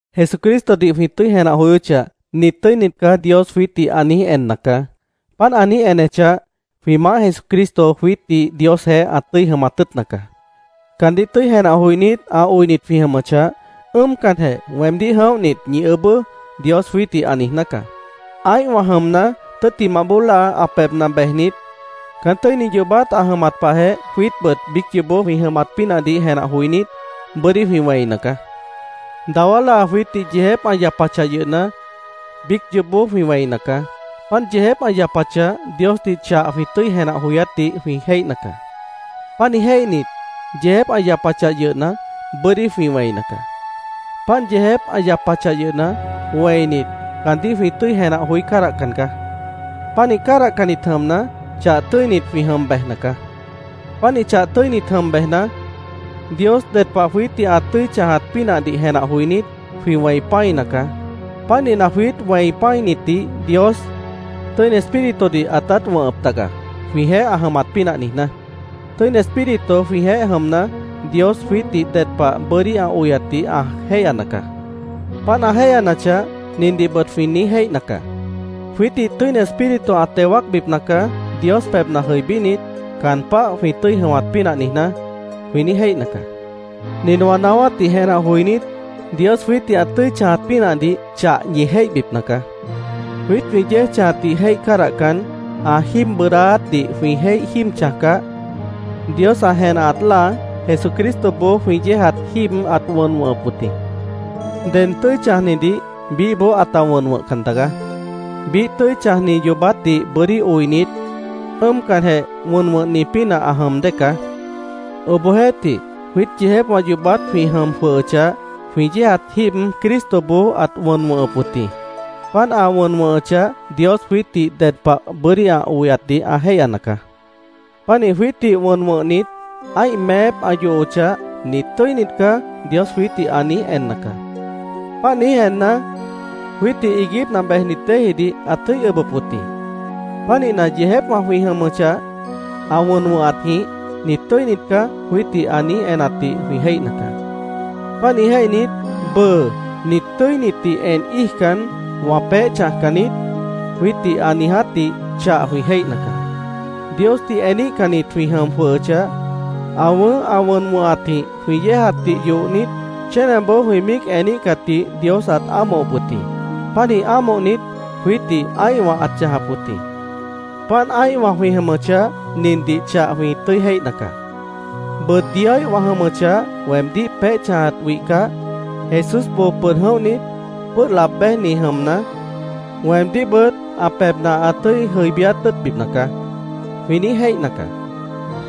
Jesucristodih jwĩ tʉ́i jenah joyóchah, “Nit tʉ́init caá”, Dios jwiítdih ã niíj enna caá. Páant ã niíj enechah, jwĩ Maáh Jesucristo jwiítdih Diosjeéh ã tʉ́i jʉmat tʉ́ʉtna caá. Caandíh tʉ́i jenah joinít, ã oinit jwĩ jʉmʉchah, “Ʉ́ʉmcanjeh weemdíh jʉ̃óhnit, ñi ʉʉ́bʉ́”, Dios jwiítdih ã niijná caá. Ã́ihwã jʉmna, tʉ́ttimah bóo láa ã pebhna bejnit, caán tʉ́ini yoobát ã jʉmat pahjeh jwiítbʉt biíc yoobó jwĩ jʉmat pínahdih jenah joinít, bʉ́dí jwĩ wẽina caá. Dawá láa jwiítdih yeejép ã yapachah yʉhna, biíc yoobó jwĩ wẽina caá. Páant yeejép ã yapachah, Diosdih chah jwĩ tʉ́i jenah joyátdih jwĩ jéihna caá. Pánih jéihnit, yeejép ã yapachah yʉhna, bʉ́dí jwĩ wẽina caá. Páant yeejép ã yapachah yʉhna, wẽinit, caandíh jwĩ tʉ́i jenah joí cádahcan caá. Pánih cádahcannit jʉmna, chah tʉ́init jwĩ jʉm bejna caá. Pánih chah tʉ́init jʉm bejna, Dios ded pah jwiítdih ã tʉ́i chãjat pínahdih jenah joinít, jwĩ wẽi pã́ina caá. Pánihna, jwiít wẽi pã́initdih Dios Tʉ́ini Espíritudih ãtát wʉ̃hʉp taga, jwĩjeéh ã jʉmat pínah niijná. Tʉ́ini Espíritu jwĩjeéh jʉmna, Dios jwiítdih ded pah bʉ́dí ã oyatdih ã jéihyana caá. Páant ã jéihyanachah, nindihbʉt jwĩ niíj jéihna caá: “Jwiítdih Tʉ́ini Espíritu ã teo wáacbipna caá, Dios pebhna jʉibínit, caan páh jwĩ tʉ́i jʉmat pínah niijná”, jwĩ niíj jéihna caá. Nin wã naáwátdih jenah joinít, Dios jwiítdih ã tʉ́i chãjat pínahdih chah ñi jéihbipna caá: Jwiít jwĩ yéej chãjatdih jéih cádahcan, ã jíib bʉʉdáátdih jwĩ jéih jíib chãjcah, Dios ã jenahat láa, Jesucristoboó jwĩ yéejat jíib ãt wʉn wʉ̃hʉp wʉt jĩ. Ded tʉ́i chãjnidih biíhboó ãta wʉn wʉ̃hcan taga. Biíh tʉ́i chãjni yoobátdih bʉ́dí oinit, ʉ́ʉmcanjeh wʉn wʉ̃hni pínah ã jʉm dée caá. Obohjeéhtih, jwiít yeejépwã yoobát jwĩ jʉm jwʉhʉchah, jwĩ yéejat jíib Cristoboó ãt wʉn wʉ̃hʉp wʉt jĩ. Páant ã wʉn wʉ̃hʉchah, Dios jwiítdih ded pah bʉ́dí ã oyatdih ã jéihyana caá. Pánih jwiítdih wʉn wʉ̃hnit, ã́ih meép ã yohochah, “Nit tʉ́init caá”, Dios jwiítdih ã niíj enna caá. Páant niíj enna, jwiítdih iiguípna bejnit déejidih ãt tʉ́i ʉbʉp wʉt jĩ. Pánihna, yeejépwã jwĩ jʉm jwʉhʉchah, ã wʉn wʉ̃hatjĩh “Nit tʉ́init caá”, jwiítdih ã niíj enatdih jwĩ jéihna caá. Pánih jéihnit, “Bʉʉ nit tʉ́initdih en íijcan, wã peéh chãjcan niít”, jwiítdih ã niijátdih chah jwĩ jéihna caá. Diosdih eníhcannit jwĩ jʉm jwʉhʉchah, ã wʉ̃ʉ́h ã wʉnatjĩh jwĩ yéejatdih yohnit, chénaboó jwĩ míic eníhcatdih Dios ãt ámohop wʉt jĩ. Pánih ámohnit, jwiítdih ã́ihwã ãt chãjap wʉt jĩ. Páant ã́ihwã jwĩ jʉmʉchah, nindih chah jwĩ tʉ́i jéihna caá: “Bʉʉ Dioíh wã jʉmʉchah, weemdíh peéh chãjat wihcah, Jesús boo pʉd jʉ̃óhnit, pʉ́ʉh laab béjni jʉmna, weemdíhbʉt ã pebhna ã tʉ́i jʉibíát tʉ́ʉtbipna caá”, jwĩ niíj jéihna caá.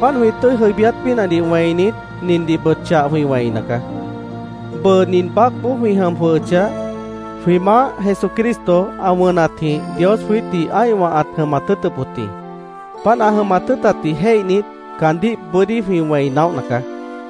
Páant jwĩ tʉ́i jʉibíát pínahdih wẽinit, nindihbʉt chah jwĩ wẽina caá: Bʉʉ nin baácboó jwĩ jʉm jwʉhʉchah, jwĩ Maáh Jesucristo ã wʉnatjĩh Dios jwiítdih ã́ihwã ãt jʉmat tʉ́ʉtʉp wʉt jĩ. Páant ã jʉmat tʉ́ʉtatdih jéihnit, caandíh bʉ́dí jwĩ wẽi naóhna caá.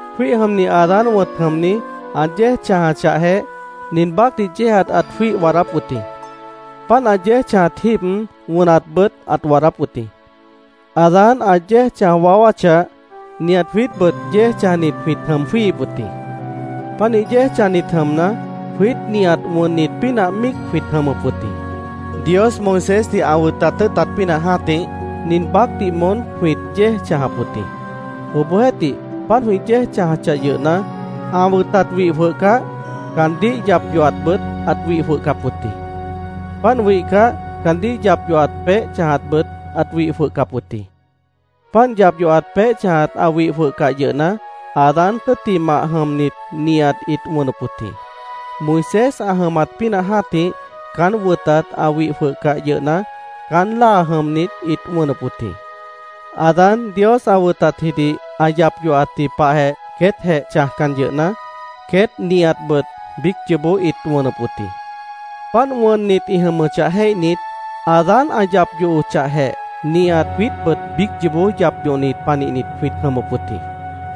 Jwíih jʉmni Adán wʉ̃t jʉmni, ã yéej chãjachahjeh, nin baácdih yéejat ãt jwíih waadáp wʉt jĩ. Páant ã yéej chãjat jíib, wʉnatbʉt ãt waadáp wʉt jĩ. Adán ã yéej chãj waáwáchah, nihat jwiítbʉt yéej chãjnit jwĩt jʉm jwíihip wʉt jĩ. Pánih yéej chãjnit jʉmna, jwiít nihat wʉnnit pínah míic jwĩt jʉmʉp wʉt jĩ. Dios Moisésdih ã wʉtat tʉ́ʉtat pínah jã́tih, nin baácdih moón jwĩt yéej chãjap wʉt jĩ. Obohjeéhtih, páant jwĩ yéej chãjachah yʉhna, ã wʉtat wih jwʉhcah, caandíh yap yohatbʉt ãt wih jwʉhcap wʉt jĩ. Páant wihcah, caandíh yap yohat peéh chãjatbʉt ãt wih jwʉhcap wʉt jĩ. Páant yap yohat peéh chãjat ã wih jwʉhcah yʉhna, Adán tʉ́ttimah jʉmnit nihat ĩt wʉnʉp wʉt jĩ. Moisés ã jʉmat pínah jã́tih, caán wʉtat ã wih jwʉhcah yʉhna, caán láa jʉmnit ĩt wʉnʉp wʉt jĩ. Adán Dios ã wʉtatjidih ã yap yohatji pahjeh queétjeh chãjcan yʉhna, queét nihatbʉt biíc yoobó ĩt wʉnʉp wʉt jĩ. Páant wʉnnit ĩ jʉmʉchah jéihnit, “Adán ã yap yohochahjeh, nihat jwiítbʉt biíc yoobó yap yohnit panihnit jwĩt jʉmʉp wʉt jĩ”,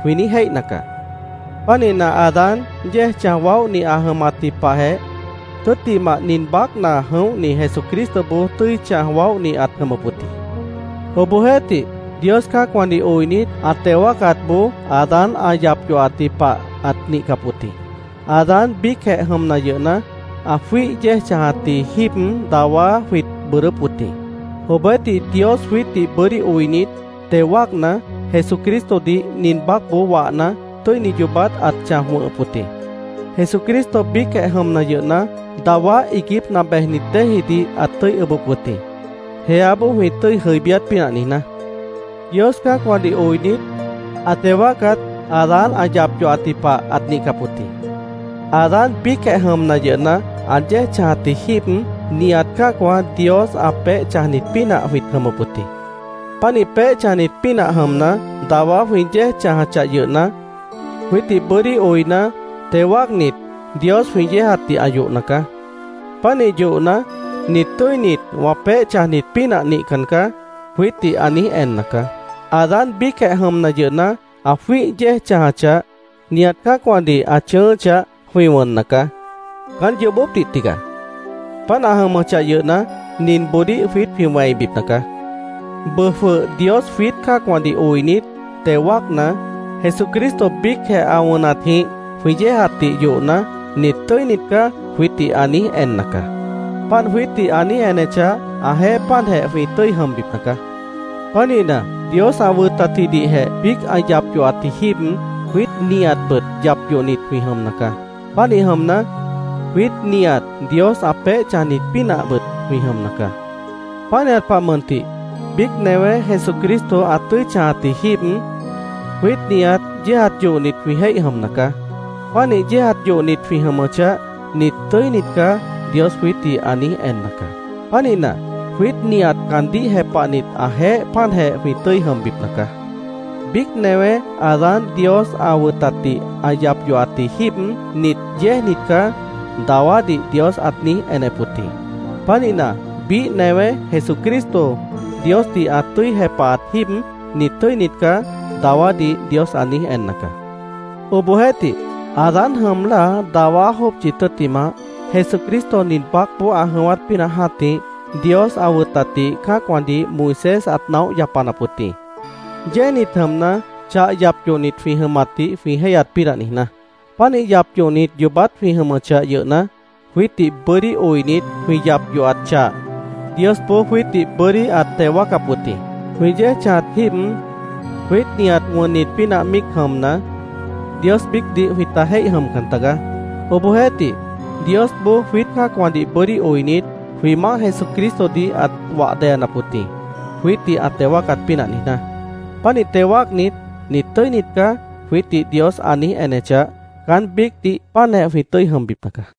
jwĩ niíj jéihna caá. Pánihna, Adán yéej chãj waóhni ã jʉmatji pahjeh, tʉ́ttimah nin baácna jʉ̃óhni Jesucristoboó tʉ́i chãj waóhni ãt jʉmʉp wʉt jĩ. Obohjeéhtih, Dios cã́acwãdih oinit, ã teo wáacatboó Adán ã yap yohatji pah ãt nihcap wʉt jĩ. Adán biícjeh jʉmna yʉhna, ã jwíih yéej chãjatji jíib dawá jwĩt bʉʉdʉ́p wʉt jĩ. Obohjeéhtih, Dios jwiítdih bʉ́dí oinit, teo wáacna, Jesucristodih nin baácboó wahna, tʉ́ini yoobát ãt chãj wʉ̃hʉp wʉt jĩ. Jesucristo biícjeh jʉmna yʉhna, dawá iiguípna bejnit déejidih ãt tʉ́i ʉbʉp wʉt jĩ, jeáboó jwĩ tʉ́i jʉibíát pínah niijná. Dios cã́acwãdih oinit, ã teo wáacat Adán ã yap yohatji pah ãt nihcap wʉt jĩ. Adán biícjeh jʉmna yʉhna, ã yéej chãjatji jíib, nihat cã́acwã Dios ã peéh chãjnit pínah jwĩt jʉmʉp wʉt jĩ. Pánih peéh chãjnit pínah jʉmna, dawá jwĩ yéej chãjachah yʉhna, jwiítdih bʉ́dí oina, teo wáacnit, Dios jwĩ yéejatdih ã yohna caá. Pánih yohna, “Nit tʉ́init, wã peéh chãjnit pínah nihcan caá”, jwiítdih ã niíj enna caá. Adán biícjeh jʉmna yʉhna, ã jwíih yéej chãjachah, nihat cã́acwãdih ã chʉ̃ʉ́ʉ́chah, jwĩ wʉnna caá. Caán yoobópdih tigaá. Páant ã jʉmʉchah yʉhna, ninboodíh jwiít jwĩ wẽibipna caá: Bʉʉ jwʉh Dios jwiít cã́acwãdih oinit, teo wáacna, Jesucristo biícjeh ã wʉnatjĩh jwĩ yéejatdih yohna, “Nit tʉ́init caá”, jwiítdih ã niíj enna caá. Páant jwiítdih ã niíj enechah, ãjeéh páantjeh jwĩ tʉ́i jʉmbipna caá. Pánihna, Dios ã wʉtatjidihjeh biíc ã yap yohatji jíib, jwiít nihatbʉt yap yohnit jwĩ jʉmna caá. Pánih jʉmna, jwiít nihat Dios ã peéh chãjnit pínahbʉt jwĩ jʉmna caá. Pánihat pah mʉntih, biíc newé Jesucristo ã tʉ́i chãjatji jíib, jwiít nihat yéejat yohnit jwĩ jéih jʉmna caá. Pánih yéejat yohnit jwĩ jʉmʉchah, “Nit tʉ́init caá”, Dios jwiítdih ã niíj enna caá. Pánihna, jwiít nihat caandíh jepahnit ãjeéh páantjeh jwĩ tʉ́i jʉmbipna caá. Biíc newé Adán Dios ã wʉtatdih ã yap yohatji jíib, “Nit yéejnit caá”, dawádih Dios ãt niíj enep wʉt jĩ. Pánihna, biíh newé Jesucristo Diosdih ã tʉ́i jepahat jíib, “Nit tʉ́init caá”, dawádih Dios ã niíj enna caá. Obohjeéhtih, Adán jʉm láa dawá jópchi tʉ́ttimah, Jesucristo nin baácboó ã jʉ̃ʉ́wát pínah jã́tih, Dios ã wʉtatdih cã́acwãdih Moisés ãt naóh yapanap wʉt jĩ, yéejnit jʉmna, chah yap yohnit jwĩ jʉmatdih jwĩ jéihyat pínah niijná. Pánih yap yohnit yoobát jwĩ jʉmʉchah yʉhna, jwiítdih bʉ́dí oinit, jwĩ yap yohat chah Diosboó jwiítdih bʉ́dí ãt teo wáacap wʉt jĩ. Jwĩ yéej chãjat jíib, jwiít nihat wʉnnit pínah míicjeh jʉmna, Dios biícdih jwĩta jéih jʉmcan tagaá. Obohjeéhtih, Diosboó, jwiít cã́acwãdih bʉ́dí oinit, jwĩ Maáh Jesucristodih ãt wah deyanap wʉt jĩ, jwiítdih ã teo wáacat pínah niijná. Pánih teo wáacnit, “Nit tʉ́init caá”, jwiítdih Dios ã niíj enechah, caán biícdih páantjeh jwĩ tʉ́i jʉmbipna caá.